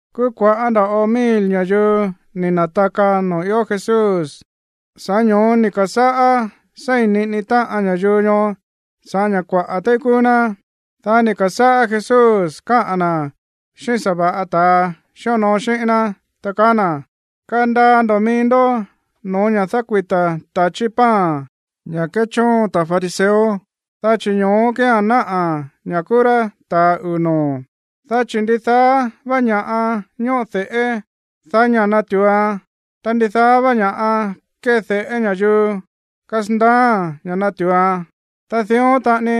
Kúú kua̱ꞌá nda̱ꞌo mil ña̱yuu ni̱ na̱taka noo̱ ió Jesús. Sa̱ꞌá ño̱ó ni̱ ka̱sáꞌá seí níꞌini táꞌan ña̱yuu ñoó sa̱ꞌá ña̱ kuaꞌa̱ téí kúú ná. Dá ni̱ ka̱sáꞌá Jesús káꞌa̱n na̱ xíꞌín sa̱va̱ꞌa ta̱a xíonoo xíꞌín ná, ta kaá na̱: ―Kandaa ndo̱ mií ndó no̱ó ña̱ dákuita̱ ta̱chí pan, ña̱ kéchóon ta̱ fariseo, dá chi̱ ño̱ó kía̱n náꞌa̱ ña̱ kúú rá ta̱ uu̱ noo̱. Dá chi̱ ndidaá vá ña̱ꞌa ñóꞌo de̱ꞌé, daí ña̱ natu̱uan. Ta ndidaá vá ña̱ꞌa kéde̱ꞌé ña̱yuu, kasandaáa̱n ña̱ natu̱uan. Ta dión taꞌani,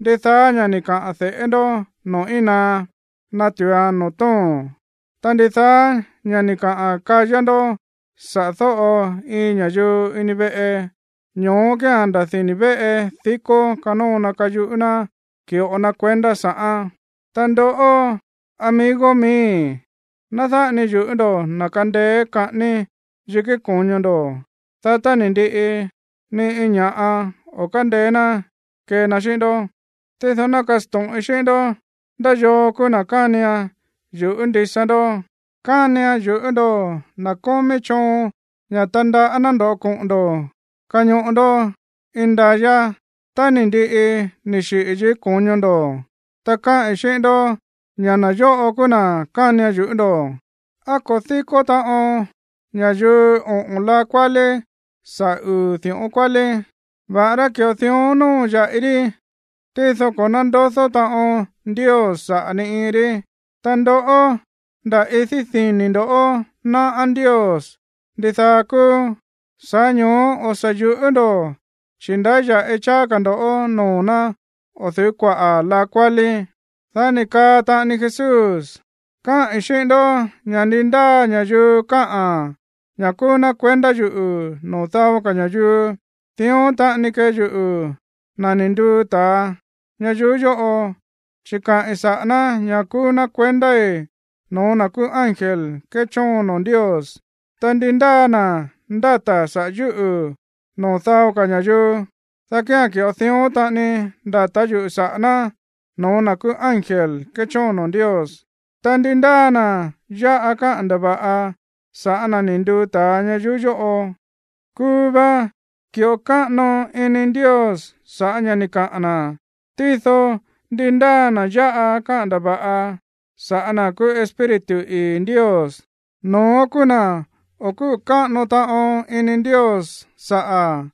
ndidaá ña̱ ni̱ kaꞌa̱n de̱ꞌé ndó noo̱ íin naá, natu̱uan noo̱ tóo̱n. Ta ndidaá ña̱ ni̱ kaꞌa̱n kayá ndó saꞌa̱ dóꞌo iin ña̱yuu ini veꞌe, ño̱ó kía̱n nda̱ dini̱ véꞌe dikó kanóo na kayuꞌú ná ki̱ꞌo na kuendá sa̱ꞌán. ’Ta ndoꞌó, amigo miíi̱, ná dáꞌa ni yu̱ꞌú ndo̱ na̱ kandeé kaꞌání yikí ko̱ño ndo̱, dá tá ni̱ ndiꞌi, ni iin ña̱ꞌa o̱ kándeé ná kee na xíꞌín ndó. Tído ná kasto̱ꞌin xíꞌín ndó ndá yoo kúú na̱ kánian yu̱ꞌú ndisa ndó: kánian yu̱ꞌú ndo̱ na̱ kómí choon ña̱ tandaꞌá ná ndoꞌó koꞌo̱n ndo̱ kañoꞌo ndó indayá tá ni̱ ndiꞌi ni̱ xiꞌi̱ yikí ko̱ño ndo̱. Ta káꞌi̱n xíꞌín ndó ña̱ na̱ yóꞌo kúú na̱ kánian yu̱ꞌú ndo̱. ¿Á ko̱ díkó taꞌon ña̱yuu oꞌo̱n laa kuálí sa̱ꞌá uu̱ di̱ꞌón kuálí? Va̱ꞌará ki̱ꞌo dión nóo ya̱ꞌi rí, tído ko̱ nándodó taꞌon Ndios saꞌa̱ ni iin rí. Ta ndoꞌó, nda̱ idí dini̱ ndo̱ náꞌá Ndios ndidaá kúú. Sa̱ꞌá ño̱ó o̱ sa̱ yu̱ꞌú ndo̱, chi̱ ndáya̱ꞌi cháá ka̱ ndo̱ noo̱ ná o̱ du̱ú kuaꞌa̱ laa kuálí. Dá ni̱ kaa taꞌani Jesús: ―Káꞌi̱n xíꞌín ndó ña̱ ndi ndáa ña̱yuu káꞌa̱n ña̱ kúú ná kuendá yuꞌu̱ noo̱ dao ka̱ ña̱yuu, dión taꞌani kee yuꞌu̱, na̱ ni̱ nduu ta̱a ñayuú yóꞌo, chi̱ kaꞌi̱n saꞌa̱ ná ña̱ kúú ná kuendái̱ no̱ó na̱ kúú ángel kéchóon noo̱ Ndios. Ta ndi ndáa na̱ ndáta̱ saꞌa̱ yúꞌu̱ noo̱ dao ka̱ ña̱yuu, dá kía̱n ki̱ꞌo dión taꞌani ndata̱ yuꞌu̱ saꞌa̱ ná no̱ó na̱ kúú ángel kéchóon noo̱ Ndios. Ta ndi ndáa na̱ yáꞌa káꞌa̱n ndava̱ꞌa sa̱ꞌá na̱ ni̱ nduu ta̱a ña̱yuu yóꞌo, kuu va ki̱ꞌo káꞌano ini Ndios sa̱ꞌá ña̱ ni̱ kaꞌa̱n na̱. Tído ndi ndáa na̱ yáꞌa káꞌa̱n ndava̱ꞌa sa̱ꞌá na̱ kúú Espíritu ii̱ Ndios, no̱ón kúú na̱ o̱ kúꞌu̱ káꞌano taꞌon ini Ndios saꞌa̱.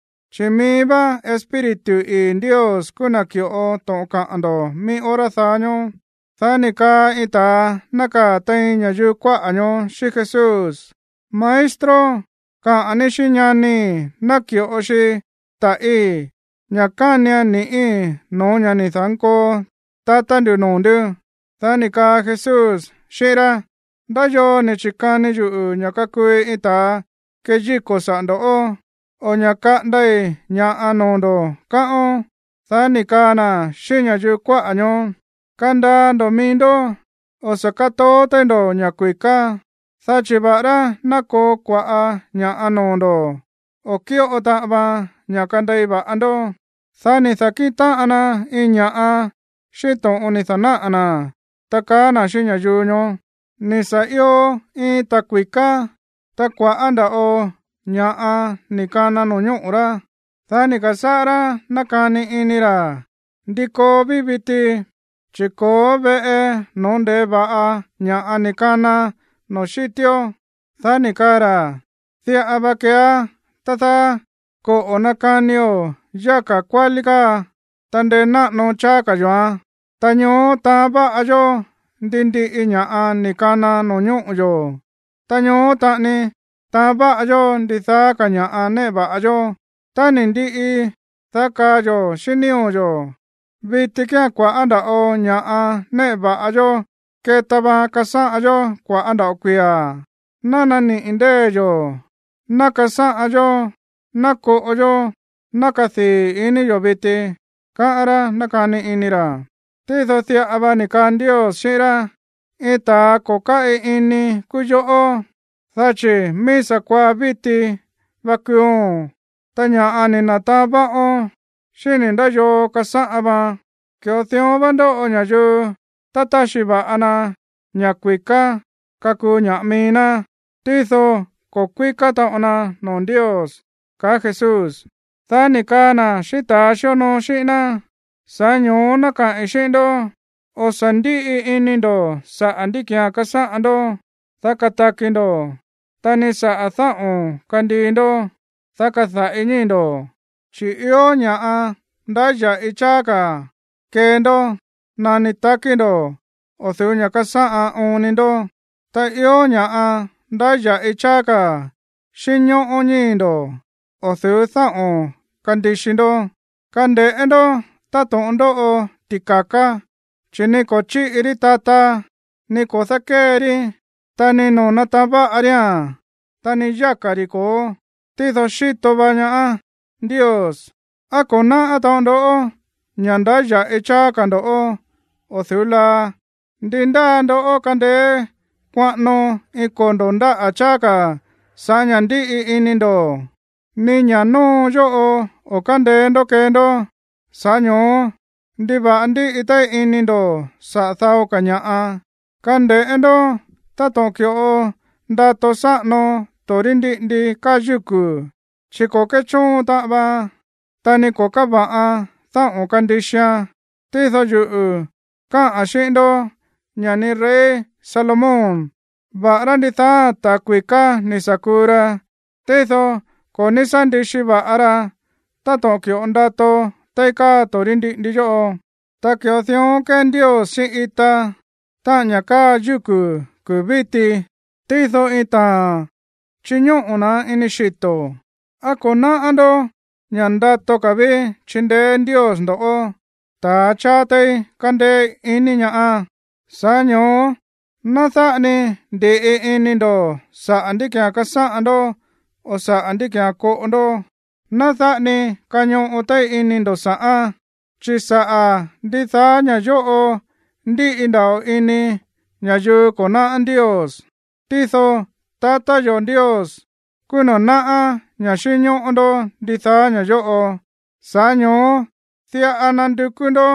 chi̱ mií vá Espíritu ii̱ Ndios kúú na̱ ki̱ꞌo to̱ꞌon kaꞌa̱n ndo̱ mií hora daá ñóó. Dá ni̱ kaa iin ta̱a nákaa̱ tein ña̱yuu kuáꞌa̱ ñoó xíꞌín Jesús: ―Maestro, kaꞌa̱n ní xíꞌín ñanii̱ ná ki̱ꞌo xi ta̱ꞌí, ña̱ kánian ni̱ꞌí no̱ó ña̱ ni̱ da̱nkoo tatá ndu̱ noo̱ ndú. Dá ni̱ kaa Jesús xíꞌín rá: ―¿Ndá yoo ni̱ chi̱kani yuꞌu̱ ña̱ kakuui iin ta̱a keyíko̱ saꞌa̱ ndo̱ꞌó, o ña̱ kaꞌandai̱ ña̱ꞌa noo̱ ndo̱, káꞌón? Dá ni̱ kaa na̱ xíꞌín ña̱yuu kuáꞌa̱ ñoó: ―Kandaa ndo̱ mií ndó. O̱ sa̱ kátoó téí ndo̱ ña̱ kui̱ká, dá chi̱ va̱ꞌará ná koo kua̱ꞌá ña̱ꞌa noo̱ ndo̱, o̱ kíꞌo taꞌan vaan ña̱ kandei va̱ꞌa ndó. Dá ni̱ da̱kíꞌin táꞌan na iin ña̱ꞌa xíꞌín to̱ꞌon ni̱ da̱náꞌa̱ na̱, ta kaá na̱ xíꞌín ña̱yuu ñoó: ―Ni̱ sa̱ io iin ta̱ kui̱ká, ta kua̱ꞌá nda̱ꞌo ña̱ꞌa ni̱ kana no̱ñóꞌo̱ rá. Dá ni̱ ka̱sáꞌá rá nákani ini ra̱: “¿Ndí koo ví viti, chi̱ ko̱ó veꞌe no̱ó nde̱e va̱ꞌa ña̱ ni̱ kana noo̱ xítió?” Dá ni̱ kaa ra̱: “Diꞌa va keeá, tá dáá. Koꞌo̱ nakanio̱ yáka̱ kuálí káa, ta ndenáꞌano cháá ka̱ yo̱án. Ta ñoó taán va̱ꞌa yó ndi ndiꞌi ña̱ꞌa ni̱ kana no̱ñóꞌo̱ yo̱. Ta ñoó taꞌani nataán va̱ꞌa yó ndidaá ka̱ ña̱ꞌa néꞌe va̱ꞌa yó. Tá ni̱ ndiꞌi, dá kaa yo̱ xíꞌín nío̱ yo̱: Viti kía̱n kua̱ꞌá nda̱ꞌo ña̱ꞌa néꞌe va̱ꞌa yó keta vaan kasáꞌan yó kua̱ꞌá nda̱ꞌo kuia̱. Ná naniꞌi̱ ndée̱ yo̱, ná kasáꞌan yó, ná koꞌo yó, ná kadii̱ ini yo̱ viti”, káꞌán rá nákani ini ra̱. Tído diꞌa va ni̱ kaa Ndios xíꞌín rá: “Iin ta̱a ko̱ káꞌi ini kúú yoꞌó, dá chi̱ mií sa̱kuaá víti va kuuo̱n, ta ña̱ ni̱ na̱taán váꞌón, ¿xíni̱ ndá yoo kasáꞌan vaan?” Ki̱ꞌo dión vá ndóꞌo ña̱yuu tá táxi va̱ꞌa na ña̱ kui̱ká kakuu ña̱ꞌa mií ná, tído ko̱ kuíká taꞌon na noo̱ Ndios ―kaá Jesús. Dá ni̱ kaa na̱ xíꞌín ta̱a xíonoo xíꞌín ná: ―Sa̱ꞌá ño̱ó ná kaꞌi̱n xíꞌín ndó, o̱ sa̱ ndíꞌi ini ndo̱ saꞌa̱ ndí ki̱án kasáꞌan ndó, dá kataki ndo̱, ta ni saꞌa̱ dáꞌo̱n kandii ndó, dá kada̱ꞌi ñíi̱ ndo̱. Chi̱ ió ña̱ꞌa ndáya̱ꞌi cháá ka̱ kee ndó nani takí ndo̱ o̱ du̱ú ña̱ kasáꞌan oon ni ndó. Ta ió ña̱ꞌa ndáya̱ꞌi cháá ka̱ xínñóꞌó ñíi̱ ndo̱ o̱ du̱ú dáꞌo̱n kandixi ndó. Kande̱ꞌé ndó táto̱ꞌon ndóꞌo ti̱ka̱ká, chi̱ ni ko̱ chíꞌi rí tata, ni ko̱ dákée rí, ta ni no̱ó taán va̱ꞌa ría̱n, ta ni yáka̱ ri̱ ko̱ó. Tído xíto va ñaá Ndios. ¿Á ko̱ náꞌá taꞌon ndó ña̱ ndáya̱ꞌi cháá ka̱ ndo̱ꞌó o̱ du̱ú laa? ¿Ndi ndáa ndó kandeé kuaꞌano iin kondo̱ ndáꞌa̱ cháá ka̱ sa̱ꞌá ña̱ ndíꞌi ini ndo̱? Ni ña̱ nóo yóꞌo o̱ kándeé ndó kee ndó, sa̱ꞌá ño̱ó, ¿ndiva̱ꞌa ndíꞌi téí ini ndo̱ saꞌa̱ dao ka̱ ña̱ꞌa? ’Kande̱ꞌé ndó táto̱ꞌon ki̱ꞌo ndato sáꞌano torí ndiꞌindi káa yúku̱, chi̱ ko̱ kéchóon taꞌan vaan, ta ni ko̱ káva̱ꞌan dáꞌo̱n kandixian. Tído yuꞌu̱ káꞌa̱n xíꞌín ndó ña̱ ni rey Salomón, va̱ꞌará ndidaáa̱n ta̱ kui̱ká ni̱ sa̱ kuu ra, tído ko̱ ní sá ndixi va̱ꞌa ra táto̱ꞌon ki̱ꞌo ndato téí káa torí ndiꞌindi yóꞌo. Ta ki̱ꞌo dión kée Ndios xíꞌín ita, táꞌa̱n ña̱ káa yúku̱ kuu̱ víti, tído iin taa̱n, chiñóꞌo̱ na̱án ini xito̱. ¿Á ko̱ náꞌá ndó ña̱ ndato ka̱ ví chindeé Ndios ndo̱ꞌó, ta̱a cháá téí kándéé ini ñaá? Sa̱ꞌá ño̱ó ná dáꞌa ni ndi̱ꞌi ini ndo̱ saꞌa̱ ndí ki̱án kasáꞌan ndó o saꞌa̱ ndí ki̱án koꞌo ndó. Ná dáꞌa ni kañoꞌo téí ini ndo̱ sa̱ꞌán. Chi̱ saꞌa̱ ndidaá ña̱ yóꞌo ndíꞌi ndava̱ꞌo ini ña̱yuu ko̱ náꞌá Ndios. Tído tatá yo̱ Ndios kúú na̱ náꞌá ña̱ xínñóꞌó ndó ndidaá ña̱ yóꞌo. Sa̱ꞌá ño̱ó diꞌa nandukú ndó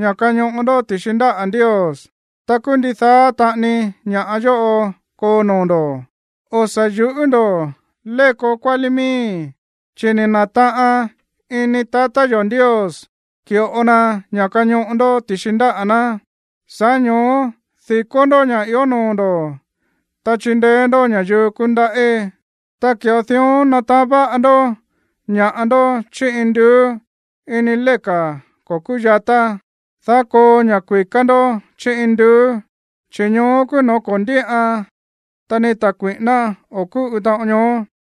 ña̱ kañoꞌo ndó ti̱xi ndáꞌa̱ Ndios, ta kúú ndidaá taꞌani ña̱ yóꞌo koo noo̱ ndo̱. ’O̱ sa̱ yu̱ꞌú ndo̱, léko kuálí miíi̱, chi̱ ni̱ na̱taꞌan ini tatá yo̱ Ndios ki̱ꞌo na ña̱ kañoꞌo ndó ti̱xi ndáꞌa̱ ná. Sa̱ꞌá ño̱ó di̱kó ndó ña̱ ió noo̱ ndo̱, ta chindeé ndó ña̱yuu kúndaꞌí, ta ki̱ꞌo dión nataán váꞌa ndó ña̱ꞌa ndó chí induú ini léka̱ ko̱ kúyatá, dá koo ña̱ kui̱ká ndó chí induú, chi̱ ñoó kúú no̱ó ko̱ ndíꞌan, ta ni ta̱ kui̱ꞌíná o̱ kúꞌu taꞌon ñoó,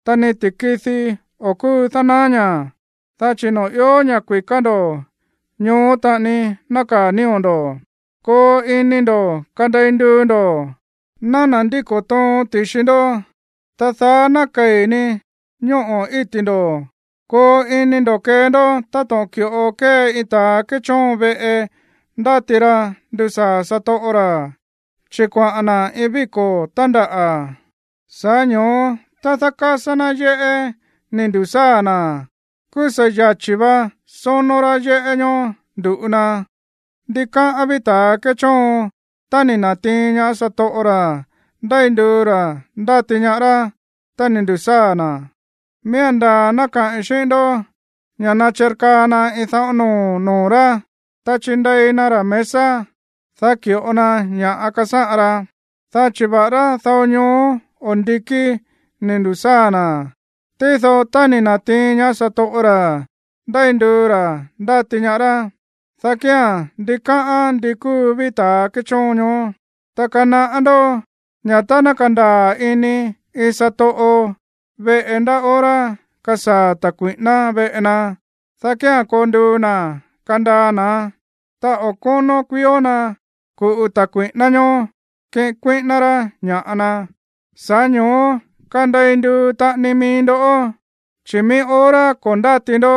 ta ni ti̱kidi o̱ kúu dánaá ñaá. Dá chi̱ noo̱ ió ña̱ kui̱ká ndo̱, ñoó taꞌani nákaa̱ nío̱ ndo̱. ’Koo ini ndo̱ kandei nduu ndo̱. Ná nandíko̱ toon ti̱xi ndó, ta daá ná kei̱ ni ñóꞌo̱ íti̱ ndo̱. Koo ini ndo̱ kee ndó táto̱ꞌon ki̱ꞌo kée iin ta̱a kéchóon veꞌe ndáti ra ndusaa̱ satoꞌo ra̱, chi̱ kuaꞌa̱n na̱ iin víko̱ tándaꞌa̱. Sa̱ꞌá ño̱ó tá dákásá ná yéꞌé ni̱ ndu̱sáa̱ na̱, kúú sa̱ yachi̱ vá sónó rá yéꞌé ñóó ndu̱ꞌu na. Ndikáꞌán ví ta̱a kéchóon tá ni̱ na̱tiin ñaá satoꞌo ra̱ ndéi nduu ra̱ ndáti ñaá rá tá ni̱ ndu̱sáa̱ na̱. Miía̱n ndaa̱ ná kaꞌi̱n xíꞌín ndó ña̱ nachirkaa na iin dáꞌo̱n noo̱ noo̱ rá, ta chinde̱i na ra̱ mesa, dá ki̱ꞌo na ña̱ꞌa kasáꞌan ra. Dá chi̱ va̱ꞌará dao ñoó o ndikí ni̱ ndu̱sáa̱ na̱, tído tá ni̱ na̱tiin ñaá satoꞌo ra̱ ndéi nduu ra̱ ndáti ñaá rá, dá kía̱n ndikáꞌán ndi kúu ví ta̱ kéchóon ñoó. Ta kanaꞌá ndó ña̱ tá ná kandaa̱ ini iin satoꞌo veꞌe ndá hora kasaa̱ ta̱ kui̱ꞌíná veꞌe na, dá kía̱n koo nduu na̱ kandaa na̱án, ta o̱ kónó kuiíó na̱ ku̱ꞌu ta̱ kui̱ꞌíná ñóó kiꞌin kuíꞌíná rá ña̱ꞌa na. Sa̱ꞌá ño̱ó kandei nduu taꞌani mií ndó, chi̱ mií hora ko̱ ndáti ndó,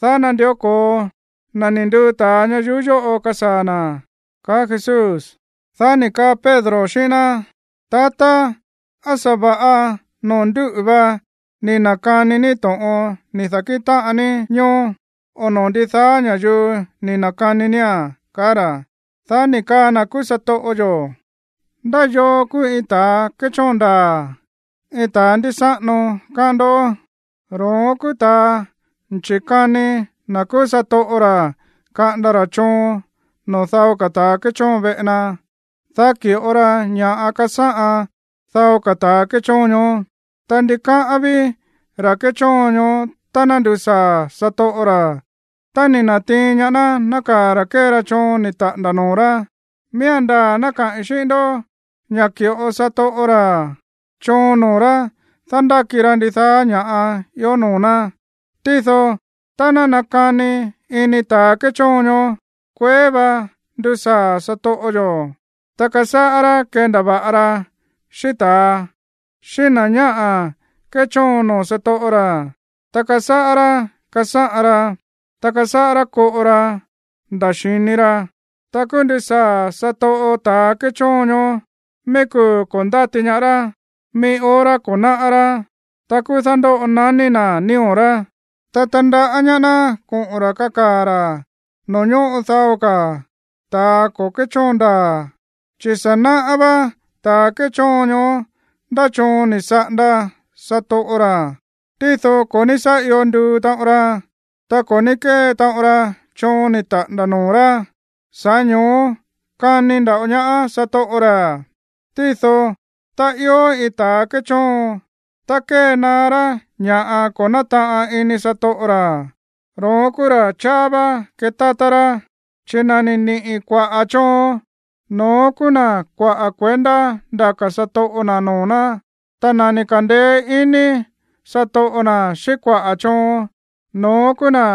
dá nandió ko̱o na̱ ni̱ nduu ta̱a ñayuú yóꞌo kasaa̱ na̱ ―kaá Jesús. Dá ni̱ kaa Pedro xíꞌín ná: ―Tatá, ¿á sa̱va̱ꞌa noo̱ ndúꞌu̱ vá ni̱ na̱kani ní to̱ꞌon ni̱ da̱kíꞌin táꞌan ní ñoó, o noo̱ ndidaá ní ña̱yuu ni̱ na̱kani nía̱n? ―kaá ra̱. Dá ni̱ kaa na̱ kúú satoꞌo yo̱: ―¿Ndá yoo kúú iin ta̱ kéchóon ndaa̱, iin ta̱ ndísáꞌano, káꞌán ndó? Ro̱ón kúú ta̱a chikani na̱ kúú satoꞌo ra̱ kaꞌanda ra̱ choon noo̱ dao ka̱ ta̱ kéchóon veꞌe na, dá ki̱ꞌo ra ña̱ꞌa kasáꞌan dao ka̱ ta̱ kéchóon ñoó. Ta ndikáꞌán ví ra̱ kéchóon ñoó tá ná ndusaa̱ satoꞌo ra̱, ta ni̱ na̱tiin ñaá ná nákaa̱ ra̱ kée ra choon ni̱ taꞌa̱nda̱ noo̱ rá. Miía̱n ndaa̱ ná kaꞌi̱n xíꞌín ndó ña̱ ki̱ꞌo satoꞌo ra̱ choon noo̱ rá dándáki ra ndidaá ña̱ ió noo̱ ná. Tído tá ná nakani ini ta̱ kéchóon ñoó: “Kueé vá ndusaa̱ satoꞌo yo̱”, ta kasáꞌá rá kendava̱ꞌa ra xíꞌín ta̱a, xíꞌín na̱ ñáꞌa̱ kéchóon noo̱ satoꞌo ra̱, ta kasáꞌá rá kasáꞌan ra, ta kasáꞌá rá koꞌo ra nda̱ xi̱ni ra, ta kúú ndusaa̱ satoꞌo ta̱ kéchóon ñoó mií kuu̱ ko̱ ndáti ñaá rá, mií hora ko̱ náꞌá rá. Ta kúú dándóꞌo naní na̱ nío̱ rá, ta tandaꞌá ñaá ná koꞌo̱n ra̱ kakaa̱ ra̱ noo̱ ñóꞌo dao ka̱ ta̱ ko̱ kéchóon ndaa̱. Chi̱ sa̱ náꞌá vá ta̱ kéchóon ñoó ndá choon ni̱ saꞌanda satoꞌo ra̱, tído ko̱ ní sá io nduu taꞌon ra, ta ko̱ ní kée taꞌon ra choon ni̱ taꞌa̱nda̱ noo̱ rá, sa̱ꞌá ño̱ó kani nda̱ꞌo ñaá satoꞌo ra̱. Tído tá ió iin ta̱a kéchóon, ta kée naá rá ña̱ ko̱ nátaꞌan ini satoꞌo ra̱, ro̱ón kúú ra̱ cháá vá ketátá rá. Chi̱ na̱ ni̱ niꞌi̱ kuaꞌa̱ choon, no̱ón kúú na̱ kuaꞌa̱ kuendá ndaka̱ satoꞌo na̱ noo̱ ná. Ta na̱ ni̱ ka̱ndeé iní satoꞌo na̱ xíꞌín kuaꞌa̱ choon, no̱ón kúú na̱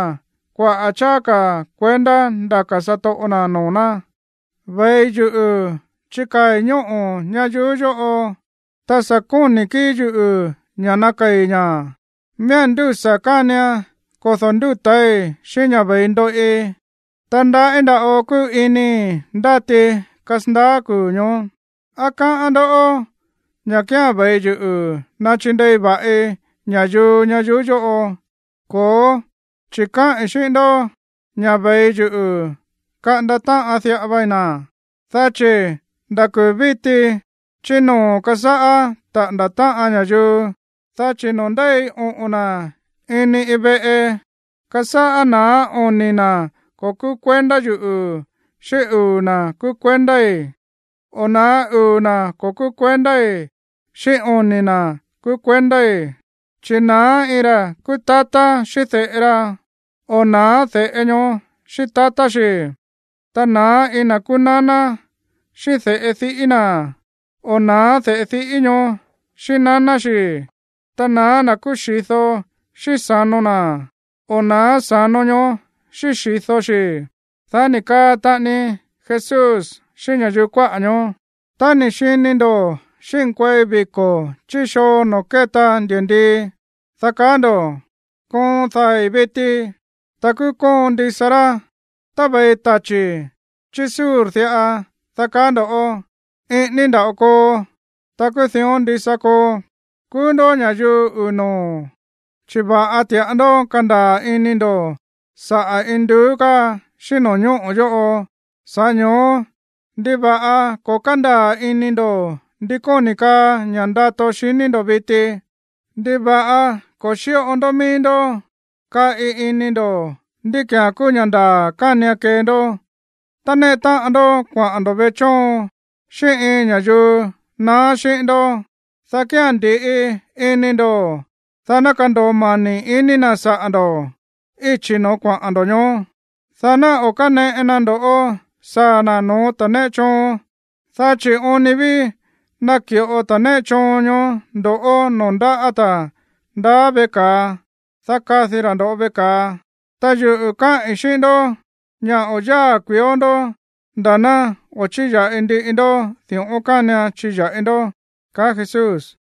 kuaꞌa̱ cháá ka̱ kuendá ndaka̱ satoꞌo na̱ noo̱ ná. ’Ve̱i yuꞌu̱ chikaa̱i̱ ñóꞌo̱ ñayuú yóꞌo, ta sa̱ kóni̱ kíi̱ yuꞌu̱ ña̱ ná nakei̱ ña̱. Miía̱n ndúsa̱ kánian kodo̱ ndúta̱í xíꞌín ña̱ ve̱i ndoꞌi. Ta ndaꞌí nda̱ꞌo kúu inii̱ ndáti kasandaá kuu̱ ñoó. ¿Á káꞌán ndoꞌó ña̱ kía̱n ve̱i yuꞌu̱ nachindei va̱ꞌi ña̱yuu ñayuú yóꞌo? Ko̱ó, chi̱ káꞌi̱n xíꞌín ndó ña̱ ve̱i yuꞌu̱ kaꞌanda táꞌan diꞌa vai na̱. Dá chi̱ nda̱ kuu̱ víti chí noo̱ kasáꞌá taꞌa̱nda̱ táꞌan ña̱yuu, dá chi̱ noo̱ ndéi oꞌo̱n na̱ ini iin veꞌe, kasáꞌá na̱á oni̱ na̱ ko̱ kúú kuendá yuꞌu̱ xíꞌín uu̱ na̱ kúú kuendái̱. O na̱á uu̱ na̱ ko̱ kúú kuendái̱ xíꞌín oni̱ na̱ kúú kuendái̱. Chi̱ na̱á iin ra̱ kúú tatá xíꞌín de̱ꞌe ra, o na̱á de̱ꞌe ñoó xíꞌín tatá xi̱. Ta na̱á iin na̱ kúú naná xíꞌín de̱ꞌe diꞌí na̱, o na̱á de̱ꞌe diꞌí ñoó xíꞌín naná xi̱. Ta na̱á na̱ kúú xi̱do xíꞌín sa̱no na̱, o na̱á sa̱no ñoó xíꞌín xi̱do xi̱. Dá ni̱ kaa taꞌani Jesús xíꞌín ña̱yuu kuáꞌa̱ ñoó: ―Tá ni̱ xini ndo̱ xínkuei viko̱ chí xoo noo̱ kéta ndi̱ndii, dá kaá ndo̱: “Koon dai̱ viti.” Ta kúú koon ndisa rá. Tá ve̱i tachi̱ chí sur diꞌa, dá kaá ndo̱: “Iꞌíní nda̱ꞌo koo.” Ta kúú dión ndisa koo. Kúú ndó ña̱yuu uu̱ noo̱, chi̱ va̱ꞌa ti̱ꞌa ndó kándaa̱ ini ndo̱ saꞌa̱ induú káa xíꞌín no̱ñóꞌo̱ yóꞌo. Sa̱ꞌá ño̱ó, ¿ndiva̱ꞌa ko̱ kándaa̱ ini ndo̱ ndi kóni̱ kaa ña̱ ndato xiní ndo̱ viti? ’¿Ndiva̱ꞌa ko̱ xíꞌo ndó mií ndó kaꞌi ini ndo̱ ndí ki̱án kúú ña̱ ndaa̱ kánian kee ndó? Tá néꞌe táꞌan ndó kuaꞌa̱n ndo̱ veꞌe chóon xíꞌín iin ña̱yuu naá xíꞌín ndó, dá kía̱n ndi̱ꞌi ini ndo̱, dá ná kando̱o mani̱ ini na̱ saꞌa̱ ndo̱ íchi̱ no̱ó kuaꞌa̱n ndo̱ ñoó. Dá ná o̱ káneꞌe na ndo̱ꞌó saa̱ na̱ no̱ó ta̱ néꞌe choon. Dá chi̱ oon ni ví naki̱ꞌo ta̱ néꞌe choon ñoó ndoꞌó noo̱ ndáꞌa̱ ta̱ ndaá veꞌe ka̱a, dá kadi ra̱ ndo̱ꞌó veꞌe ka̱a. Ta yuꞌu̱ káꞌi̱n xíꞌín ndó ña̱ o̱ yáa̱ kuiíó ndoꞌó nda̱ ná o̱ chíya̱ꞌi ndiꞌi ndó di̱ꞌón kánian chiya̱ꞌi ndó ―kaá Jesús.